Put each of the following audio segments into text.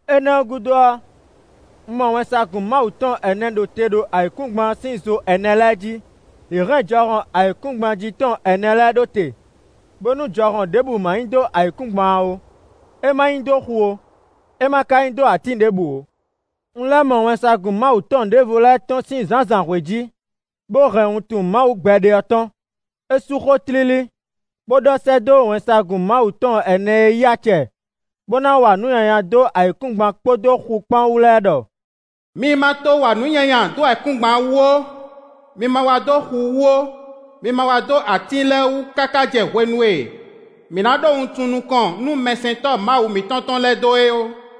Énɛ́ ɔ́ gúdo ɔ́, un mɔ wɛnsagun Mawu tɔn ɛnɛ ɖo te ɖo ayǐkúngban ɔ́ sín zo ɛnɛ lɛ́ɛ jí; yě hɛn jɔhɔn ayǐkúngban jí tɔn ɛnɛ lɛ́ɛ ɖó te, bónú jɔhɔn ɖěbǔ ma nyi dó ayǐkúngban ɔ́ ó, é ma nyi dó xu ó; é ma ka nyi dó atín ɖěbǔ ó. Un lɛ́ mɔ wɛnsagun Mawu tɔn ɖěvo tɔ́n sín zǎnzǎnhwe jí, bó hɛn wuntun Mawu gbɛɖe ɔ́ tɔn. É sú xó tlílí, bó ɖɔ sɛ́ dó wɛnsagun Mawu tɔn ɛnɛ e yí acɛ, bó ná wa nǔ nyanya dó ayǐkúngban kpódó xu kpán wú lɛ́ɛ ɖɔ: “Mi ma to wa nǔ nyanya dó ayǐkúngban wú ó; mi ma wa dó xu wú ó; mi ma wa dó atín lɛ́ɛ wú káká jɛ hwenu e mǐ ná ɖó wuntun nukɔn nú mɛsɛntɔ́ Mawu mǐtɔn tɔn lɛ́ɛ dó é ó.”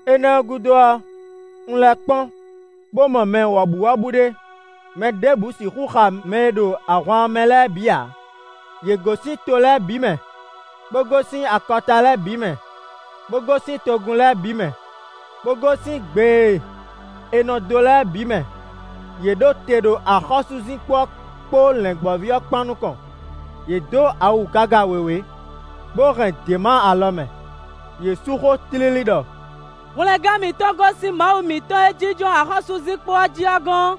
Énɛ́ ɔ́ gúdo ɔ́, un lɛ́ kpɔ́n bó mɔ mɛ wɔ̌buwɔ́bú ɖé: mɛ ɖěbǔ sixú xa mɛ e ɖo ahwan ɔ́ mɛ lɛ́ɛ bǐ ǎ. Yě gosín to lɛ́ɛ bǐ mɛ, bó gosín akɔta lɛ́ɛ bǐ mɛ, bó gosín togun lɛ́ɛ bǐ mɛ, bó gosín gbe e è nɔ dó lɛ́ɛ bǐ mɛ; yě ɖo te ɖo axɔ́súzinkpo ɔ́ kpó Lɛ̌ngbɔ́ví ɔ́ kpán nukɔn; yě dó awu gaga wěwé, bó hɛn děma alɔ mɛ. Yě sú xó tlílí ɖɔ: “Hwlɛngán mǐtɔn gosín Mawu mǐtɔn e jínjɔ́n axɔ́súzinkpo jí ɔ́ gɔ́n,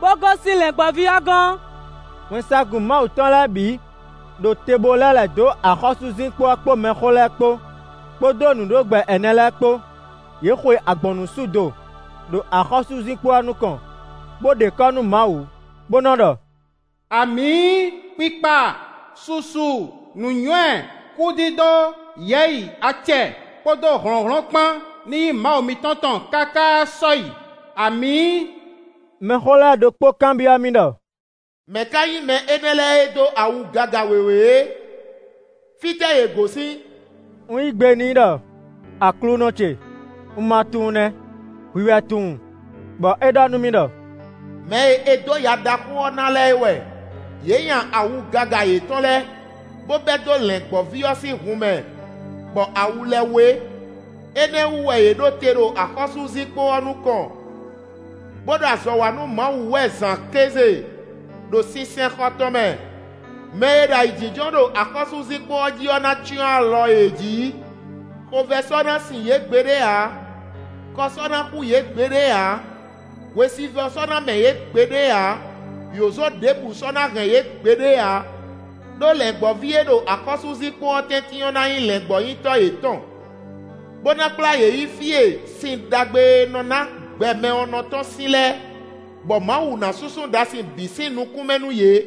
bó gosín Lɛ̌ngbɔ́ví ɔ́ gɔ́n!” Wɛnsagun Mawu tɔn lɛ́ɛ bǐ ɖo te bó lɛ́ lɛ̌ dó axɔ́súzinkpo ɔ́ kpó mɛxó lɛ́ɛ kpó, kpódó nǔɖogbɛ ɛnɛ lɛ́ɛ kpó. Yě xwe agbɔ̌nnusú do ɖo axɔ́súzinkpo ɔ́ nukɔn, bó ɖe kɔ́ nú Mawu, bó nɔ ɖɔ: “Amǐ! Kpikpa, susu, nǔnywɛ́, kúdídó, yɛ̌yi, acɛ, kpódó hlɔ̌nhlɔ́n kpán ní nyí Mawu mǐtɔn tɔn káká sɔ́yi! Amǐ!” Mɛxó lɛ́ɛ ɖokpó kanbyɔ́ mì ɖɔ: “Mɛ̌ ka nyí mɛ énɛ́ lɛ́ɛ e dó awu gaga wěwé é? Fítɛ́ yě gosín?” Un yí gbe n'i ɖɔ: “Aklúnɔ ce, un ma tunwun nɛ́, hwi wɛ tunwun.” Bɔ é ɖɔ nú mì ɖɔ: “Mɛ e è dǒ ya ɖaxó ɔ́ ná lɛ́ɛ é wɛ. Yě nya awu gaga yětɔn lɛ́ɛ, bó bɛ́ dó Lɛ̌ngbɔ́ví ɔ́ sín hun mɛ, bɔ awu lɛ́ɛ wé. Énɛ́ ɔ́ wú wɛ yě ɖo te ɖo axɔ́súzinkpo ɔ́ nukɔn, bó ɖo azɔ̌ wa nú Mawu wɛ zǎn kéze ɖo sinsɛnxɔ tɔn mɛ. Mɛ e ɖo ayǐjínjɔ́n ɖo axɔ́súzinkpo ɔ́ jí ɔ́ ná cyɔ́n alɔ yě jǐ. Xovɛ́ sɔ́ ná sin yě gbeɖé ǎ; kɔ sɔ́ ná xú yě gbeɖé ǎ; hwesivɔ́ sɔ́ ná mɛ yě gbeɖé ǎ; yǒzo ɖěbǔ sɔ́ ná hɛn yě gbeɖé ǎ. Đó Lɛ̌ngbɔ́ví e ɖo axɔ́súzinkpo ɔ́ tɛ́ntin ɔ́ ná nyí Lɛ̌ngbɔ́nyitɔ́ yětɔn, bó ná kplá yě yi fí e sin ɖagbe e nɔ ná gbɛ mɛ ɔ́ nɔ tɔ́n sín lɛ́ɛ. Bɔ Mawu ná súnsún ɖasin bǐ sín nukún mɛ nú yě.”